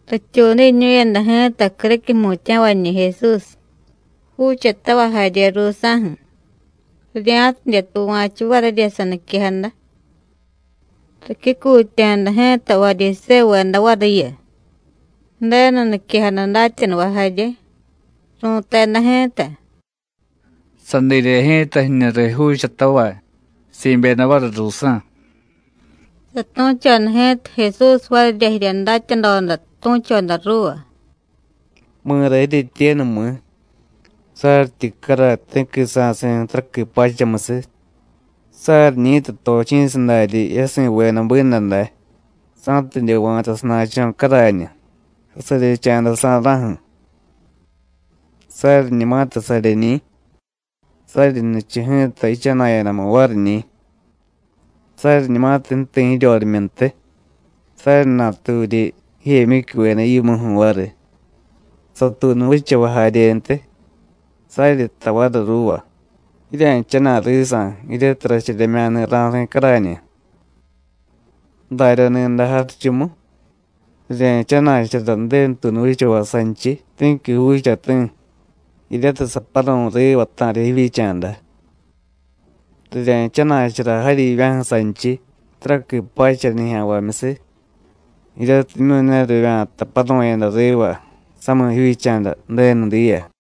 Rityuudiñu̱yada ji̱ta criquiy jmutya̱vañi̱ Jesús, juuchatavay jarye ruusa̱ju̱, rirya̱tidye tuva̱chu varirya saniquejada. Ricyucutya̱da ji̱ta Varyisévuveda variyu, Ju̱denu niquejada datyanuvay jarye. Ru̱teda ji̱ta: “Sadirye ji̱ta jiñu riy juuchatavay, si̱byeda variy ruusa̱.” Satu̱choda ji̱ta Jesús varirya jirya datyadoda tu̱choda ruuva: “¿Mi̱ra jiryetyenu, mi̱? saryityi caray ti̱qui sa̱si̱ taraqui pachamusiy, saryiñi̱tiy tochi̱sadaryi yasi̱veda binda day, sa̱tidye va̱ta sana̱cho̱ carañu, sasaryecha̱dasa̱ra̱ju̱. Saryiñumatiy saryeñi̱, saryi nichu ji̱ta yichana̱yadamu variñi̱. Saryiñumatiy ju̱ti̱ jiryorimyuntiy, saryi naturyi jijemyicyuveda yimuju̱ variy, satuunuvichavay jaryentiy, saryi jtay variy ruuva: Jirya̱jchana̱y risa̱, jiryatiy racharyemya̱ni̱ ra̱si̱ carañu. Darya ni̱day jarichumu, rirye̱jchana̱chara Ju̱denu tuunu vichavay sanchiy ti̱qui juuchati̱, jiryatiy saparu̱y riva ta̱riy jivyicha̱da. Rirye̱jchana̱chara jaryivya̱ju̱ sanchiy, taraqui pacha nijya̱nvamyusiy, jiryatimyu̱ ne rivya̱ta paru̱yada riva samiy jivyicha̱da Ju̱denu diya.”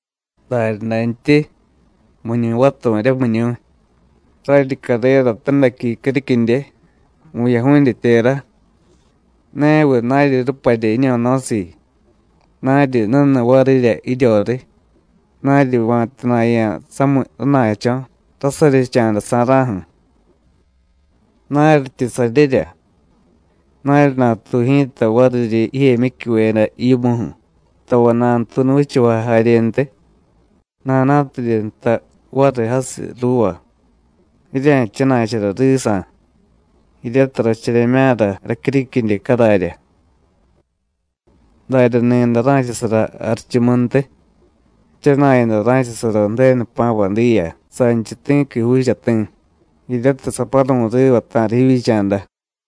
“Daryadantyi, ¿miñu̱y vaturu̱rya, miñu̱y? raryi carera tadaqui criquidye, vu̱yaju̱dye tera, neviy naryi ruparya jiño̱no̱siiy, naryi nuniy varirya jiryoriy, naryi va̱tana̱ya̱ samiy rana̱cho̱, rasaryecha̱dasa̱ra̱ju̱. Naryityi saryerya, naryi natuy ji̱ta variryi jijemyicyuveda yimuju̱, tavay nanutuunu vichavay jaryentiy, nana̱tidye jtay variy jasiy ruuva: Jirya̱jchana̱chara risa̱, jiryatiy racharyemya̱ra racyuriquidye cararya. Darya ni̱day ra̱chasara jarichumuntiy, jchana̱yada ra̱chasara Ju̱denu jpa̱vay diya sanchiy ti̱qui juuchati̱, jiryatiy saparu̱y riva ta̱riy jivyicha̱da.”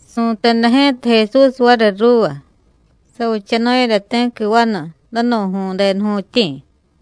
Su̱teda ji̱ta Jesús variy ruuva: “Savichanu̱yada ti̱qui vanu, danu̱ju̱y denuju̱tyi̱.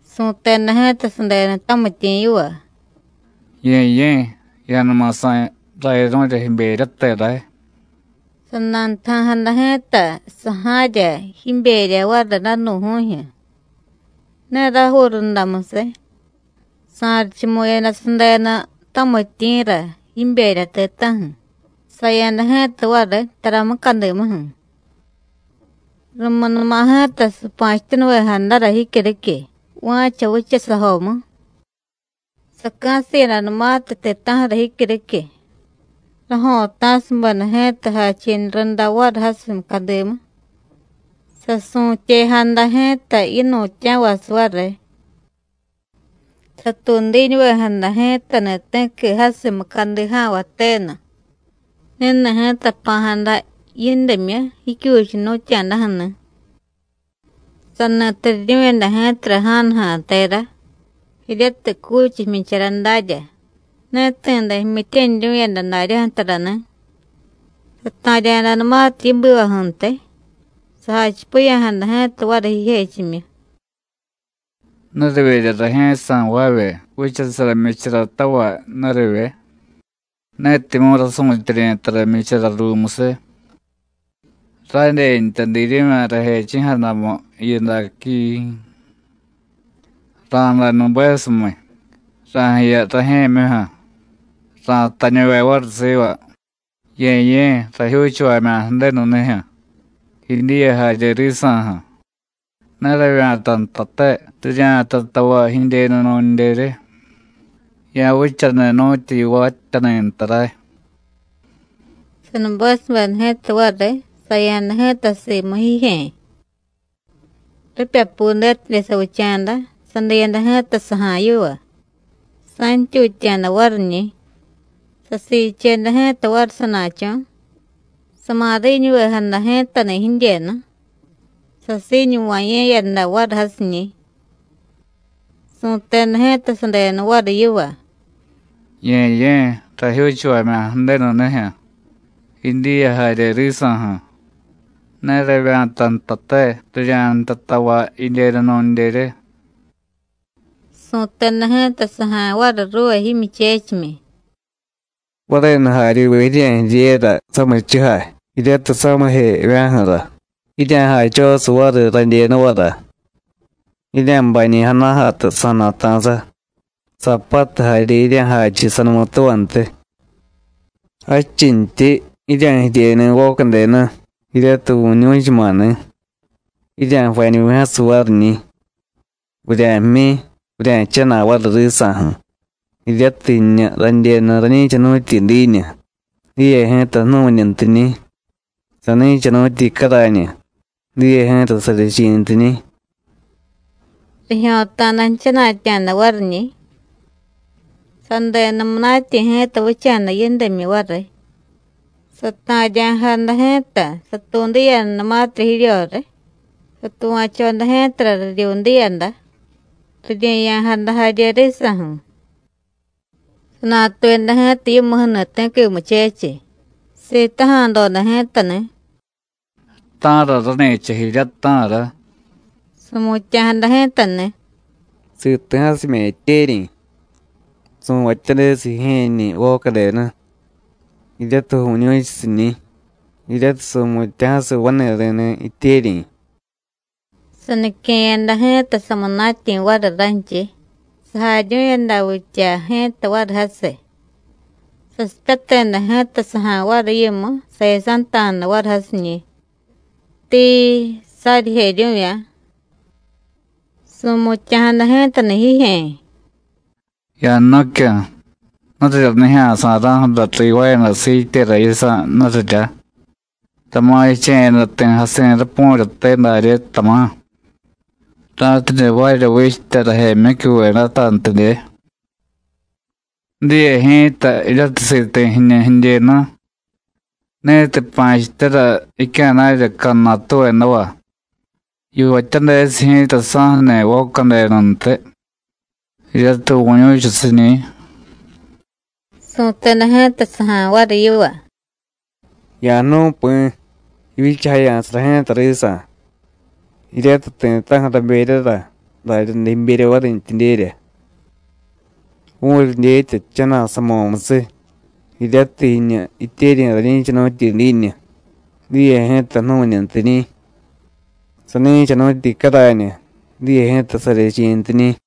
Su̱teda ji̱ta sadenu tamityi̱ yiva: Ye̱ye̱, ya̱numa sa̱y rayaru̱rya jiberyate ray. Sanantaja̱jada ji̱ta saja̱rya jiberya variy danu̱ju̱jyu̱. Ne rajuu rundamusiy, sa̱richumu̱yada sadenu tamityi̱ra jiberya ti̱ta̱ju̱, saya̱da ji̱ta variy tara mucadimuju̱. Rumunuma ji̱ta sapa̱chityanuvejadara jicyuriquiy, va̱cha vichasajomu. Saca̱siyadanumatiy ti̱ta̱ju̱ra jicyuriquiy, rajo̱ta̱subeda ji̱ta jachi̱nu runda variy jasiy mucadimu, sasu̱tyejada ji̱ta yinu̱tya̱vasiy variy. Satuudiñuvejada ji̱tani̱ ti̱qui jasiy mucadija̱nvay tenu. Ni̱ni̱ ji̱ta jpa̱jada yindimyu, jicyuchiy jnu̱tya̱daju̱ni̱. Sani turiryu̱yada ji̱tara ja̱nuja̱ tera, jiryatiy cuchiy jmyichara darya. Ne ti̱de jmyityaniryu̱yada daryaju̱ tarani̱. Sata̱rya̱danumatiy yibivaju̱ntiy, sajachipiya̱jada ji̱ta variy jijechimyu: ¿Nurivyerya rajye̱jsa̱ jvaavye vichasara jmyicharatavay, nurivye? netimyu̱ rasu̱tyeryi̱ tara jmyichara ruumusiy, ¡radyentya diiryu̱vya̱ rajechi̱jadamu jiyu daquiii! Ra̱day nubesumiy, ra̱jiya rajye̱myuju̱, ra̱jtañuve variy siva: Ye̱ye̱, rajyuuchuvamya̱ Ju̱denunijyu̱, jidyiya jarye risa̱ju̱. Ne ravya̱ta ntate rirya̱jtay tavay jidyenu nu̱ndyerye. Ya̱vichaniy nu̱tyu yivaatyaniy nta ray. Sanubesubeda ji̱ta variy, saya̱da ji̱ta simu jijye̱. Ripyapudetidye savicha̱da, sadiyada ji̱ta saja̱y yiva, sa̱ntyutya̱da variñi̱. Sasiicheda ji̱ta variy sana̱cho̱, samariñuvejada ji̱tani̱ jidyenu, sasiiñuva̱ye̱yada variy jasiñi̱. Su̱teda ji̱ta sadenu variy yiva: Ye̱ye̱, rajyuuchuvamya̱ Ju̱denunijyu̱, jidyiya jarye risa̱ju̱: ne ravya̱ta ntate, rirya̱jtay tavay jidyenu nu̱ndyerye. Su̱teda ji̱ta saja̱y variy ruuva jimyuchechimyi: Varenu jaryuve jirye̱jiryera samichujay, jiryatiy samijevya̱ju̱ra, jirya̱jachosiy variy radyenuvara; jirya̱bañi̱ jana̱jatu sa̱na̱ta̱sa, saapatu jarye jirya̱jachu sanumutuvantiy. Jadchintyi, jirya̱jiryeni̱ vocadenu, jiryatiy vu̱ñu̱chuma̱ni̱, jirya̱jvañuvi̱jasiy variñi̱. Vurya̱jmyi, vurya̱jchana̱y variy risa̱ju̱, jiryatiy jiñu radyenu rañi̱chanu̱tyi diiñu, diye ji̱ta jnu̱ñuntiñi̱; sani̱chanu̱tyi carañu, diye ji̱ta saryechi̱ntiñi̱. Rijyo̱ta̱da jchana̱tya̱da variñi̱. Sadenu munatyi̱ ji̱ta vicha̱da yindimyu variy. Sata̱rya̱jada ji̱ta, satuudiyadanumatirya jiryoriy, satuva̱choda ji̱tara riryudiyada, rirye̱ya̱jada jarye risa̱ju̱. Sanatuyada ji̱ta yimuju̱ni̱ ti̱qui muchechiy, sitaja̱doda ji̱tani̱: ¿Ta̱ra rani̱cha jirya, ta̱ra? Su̱mutya̱jada ji̱tani̱: Siti̱jasimya̱ jityeryi̱. Su̱vatyadesiy jijye̱ñi̱ vocadenu, jiryatiy vu̱ñu̱chusiñi̱, jiryatiy su̱mutya̱jasiy vani̱ri̱ni̱ jityeryi̱. Sanique̱yada ji̱ta samunatyi̱ variy ranchiy, sajaryu̱yada vitya ji̱ta variy jasiy. Sasipyateda ji̱ta saja̱y variy yimu, sayasanta̱da variy jasiñi̱. Tiii, saryijeryu̱vya̱. Su̱mutya̱jada ji̱tani̱ jijye̱. Ya̱jnu̱cyu̱, nurirya nijya̱sa̱ra̱ju̱ra rivaayada siityera yisa̱, nurirya, tama̱ jiche̱yada ti̱ jasi̱ rapu̱ryate darye, tama̱, ra̱tidye jvaarya vichtya rajyemyicyuvedatantidye. Diye ji̱ta, jiryatiy siti̱ jiñu jidyenu, ni̱tiy pa̱chityara jicya̱na̱rya cadnatuvedava, yivatyadesiy ji̱ta saju̱ni̱ vocadenuntiy, jiryatiy vu̱ñu̱chusiñi̱. Su̱teda ji̱ta saja̱y variy yiva: Ya̱jnu̱y Pi̱, jivyichajaya̱sara ji̱ta risa̱. Jiryatiy ti̱ta̱ju̱ raberyara, daryaday jiberya varintyidyerya. Vu̱ryi dyetya jchana̱y samo̱musiy, jiryatiy jiñu jityeryi̱ rañi̱chanu̱tyi diiñu, diye ji̱ta jnu̱ñuntiñi̱; sani̱chanu̱tyi carañu, diye ji̱ta saryechi̱ntiñi̱.”